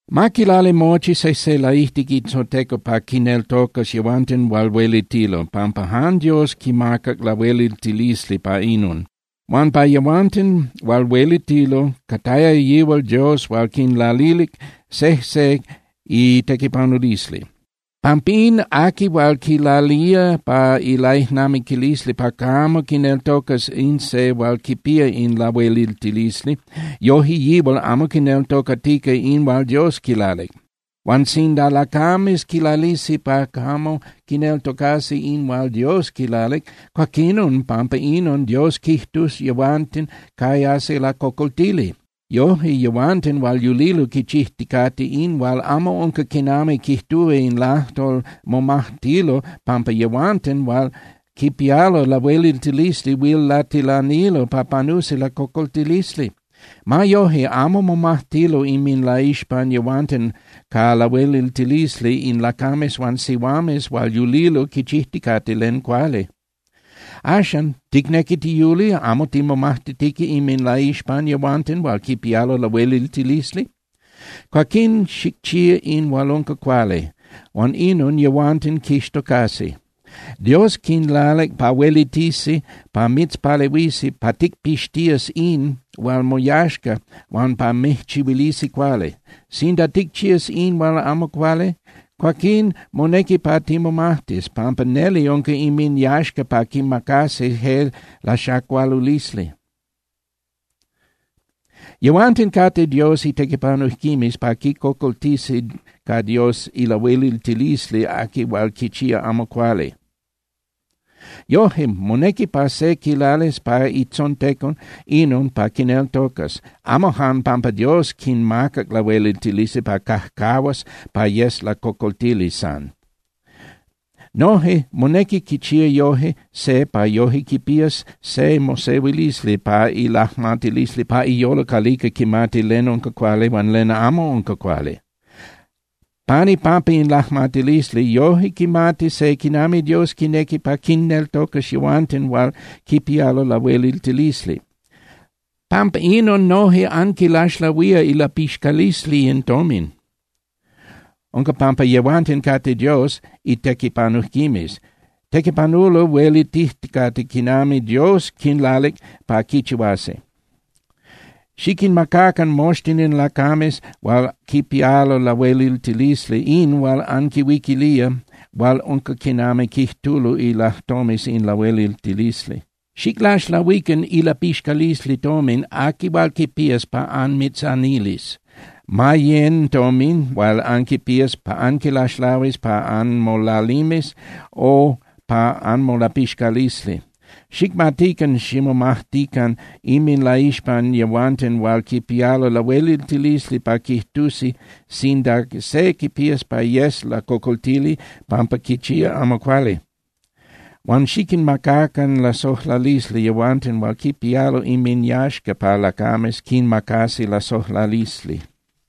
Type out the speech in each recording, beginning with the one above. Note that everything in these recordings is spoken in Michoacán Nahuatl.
Ma quilali mochi sejse laijtic itzontecon pa quinneltocas yehuanten hual huelitilo, pampa jan Dios quimacac lahueliltilisli pa inon. Huan pa yehuanten hual huelitilo cataya yihual Dios hual quinlalilic sejse itequipanulisli. Pampín, aqui hual quilalía pa ilaijnamiquilisli pa camo quineltocas in se hual quipía in lahueliltilisli, yoje yihual amo quineltocatica in hual Dios quilalic. Huan sinda lacames quilalisi pa camo quineltocasi in hual Dios quilalic, cuaquinon pampa inon Dios quijtus yehuanten cayasi lacocoltili. Yoje, yehuanten hual yulilo quichijticate in hual amo unca quinami quijtúa in lajtol momajtilo pampa yehuanten hual quipialo lahueliltilisli huil latilanilo pa panusi lacocoltilisli. Ma yoje, amo momajtilo inminlaixpan yehuanten ca lahueliltilisli in lacames huan sihuames hual yulilo quichijticate len cuali. Axan, ¿ticnequi tiyuli amo timomajtitica inminlaixpan yehuanten hual quipialo lahueliltilisli? Cuaquín xicchía in hual unca cuali, huan inon yehuanten quixtocasi. Dios quinlalic pa huelitisi pa mitzpalehuisi pa ticpixtías in hual moyaxca huan pa mijchihuilisi cuali. Sinda ticchías in hual amo cuali, cuaquín monequi pa timomajtis, pampa neli unca inminyaxca pa quinmacasi je laxacualulisli. Yehuanten cate Dios itequipanujquimes pa quicocoltisi ca Dios ilahueliltilisli aqui hual quichía amo cuali. Yoje, monequi pa se quilalis pa itzontecon inon pa quinneltocas, amo jan pampa Dios quinmacac lahueliltilisli pa cajcajuas pa yes lacocoltili san. Noje monequi quichía yoje se pa yoje quipías se mosehuilisli pa ilajmatilisli pa iyolo calica quimati len unca cuali huan len amo unca cuali. Pan ipampa in lajmatilisli, yoje quimati se quinami Dios quinequi pa quinneltocas yehuanten hual quipialo lahueliltilisli. Pampa inon noje anquilaxlahuía ilapixcalisli in tomin. Unca pampa yehuanten cate Dios itequipanujquimes. Tequipanulo huelitijticate quinami Dios quinlalic pa quichihuasi. Xiquinmacacan moxtin in lacames hual quipialo lahueliltilisli in hual anquinhuiquilía hual unca quinami quijtulo ilajtomes in lahueliltilisli. Xiclaxlahuican ilapixcalisli tomin aqui hual quipías pa anmitzanilis, ma yén (yecan) tomin hual anquipías pa anquilaxlahuis pa anmolalimes o pa anmolapixcalisli. Xicmatican ximomajtican inminlaixpan yehuanten hual quipialo lahueliltilisli pa quijtusi sinda se quipías pa yes lacocoltili pampa quichía amo cuali. Huan xiquinmacacan lasojlalisli yehuanten hual quipialo inminyaxca pa lacames quinmacasi lasojlalisli.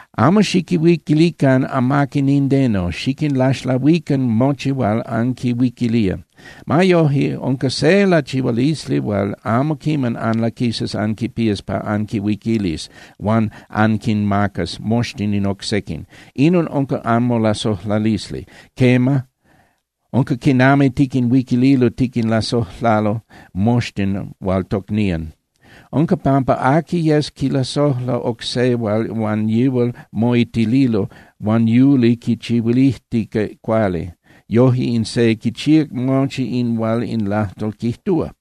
Amo xiquihuiquilican amaqui nindeno, xiquinlaxlahuican mochi hual anquihuiquilía. Ma yoje, unca se lachihualisli hual amo quiman anlaquisas anquipías pa anquihuiquilis huan anquinmacas moxtin in oc sequin. Inon unca anmolasojlalisli. Quema, unca quinami tiquinhuiquililo tiquinlasojlalo moxtin hual tocnían. Unca pampa aqui yes quilasojla oc se hual huan yihual moitililo huan yuli quichihuilijtica cuali, yoje in se quichíac mochi in hual in lajtol quijtúa.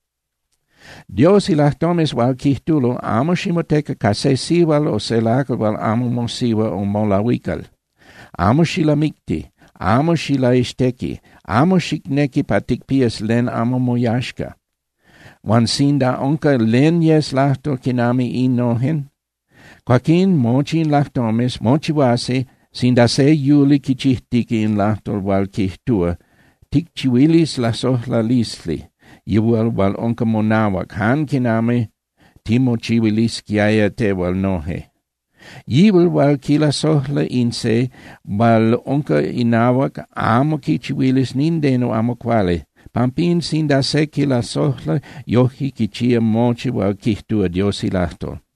Dios ilajtomes hual quijtulo: “Amo ximoteca ca se sihual o se lacal hual amo mosihua o molahuical, amo xilamicti, amo xilaixtequi, amo xicnequi pa ticpías len amo moyaxca”; huan sinda unca len yes lajtol quinami innojen, cuaquín mochi in lajtomes mochihuasi sinda se yuli quichijtica in lajtol hual quijtúa: “Ticchihuilis lasojlalisli yihual hual unca monahuac jan quinami timochihuilisquiaya tehual noje.” Yihual hual quilasojla in se hual unca inahuac amo quichihuilis nindeno amo cuali. Pampín, sinda se quilasojla, yojque quichía mochi hual quijtúa Dios ilajtol.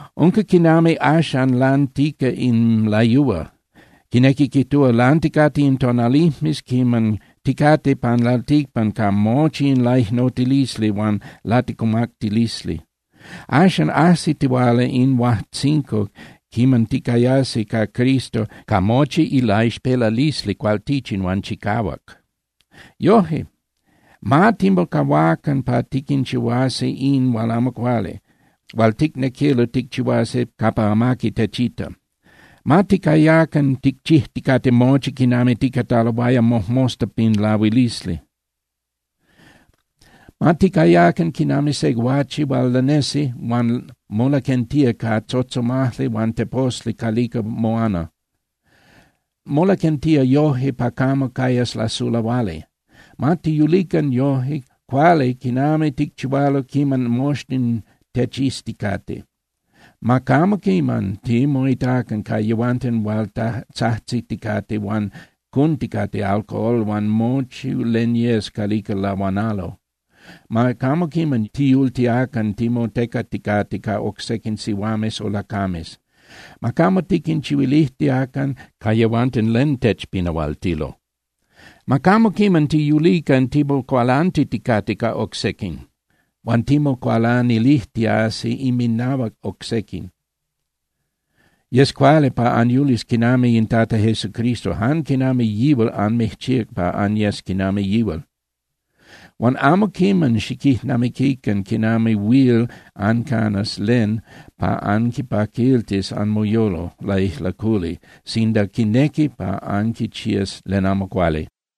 Unca quinami axan lantica in layúa, quinequi quijtúa, lanticate in tonalijmes quiman ticate pan lalticpan ca mochi in laicnotilisli huan laticumactilisli. Axan ajsitihuala in huajtzinco quiman ticayasi ca Cristo ca mochi ilaixpelalisli cualtichin huan chicahuac. Yoje, ma timocahuacan pa tiquinchihuasi in hual amo cuali, hual ticnequilo ticchihuasi capa amaqui techita. Ma ticayacan ticchijticate mochi quinami ticataloaya mojmosta pin lahuilisli. Ma ticayacan quinami se guache hual lanesi huan molaquentía ca tzotzomajli huan teposli calica moana. Molaquentía yoje pa camo cayas lasulahuali. Ma tiyulican yoje cuali quinami ticchihualo quiman moxtin techizticate. Ma camo quiman timoitacan ca yehuanten capa tzajtziticate huan cunticate alcohol huan mochi len yes calica lahuanalo. Ma camo quiman tiyultiacan timotecaticate ca oc sequin sihuames o lacames. Ma camo tiquinchihuilijtiacan ca yehuanten len techpinahualtilo. Ma camo quiman tiyulican timocualantiticate ca oc sequin, huan timocualanilijtiasi inminahuac oc sequin. Yes cuali pa anyulis quinami in Tata Jesucristo, jan quinami yihual anmijchíac pa anyes quinami yihual. Huan amo quiman xiquijnamiquican quinami huil ancanas len pa anquipaquiltis anmoyolo laijlaculi sinda quinequi pa anquichías len amo cuali.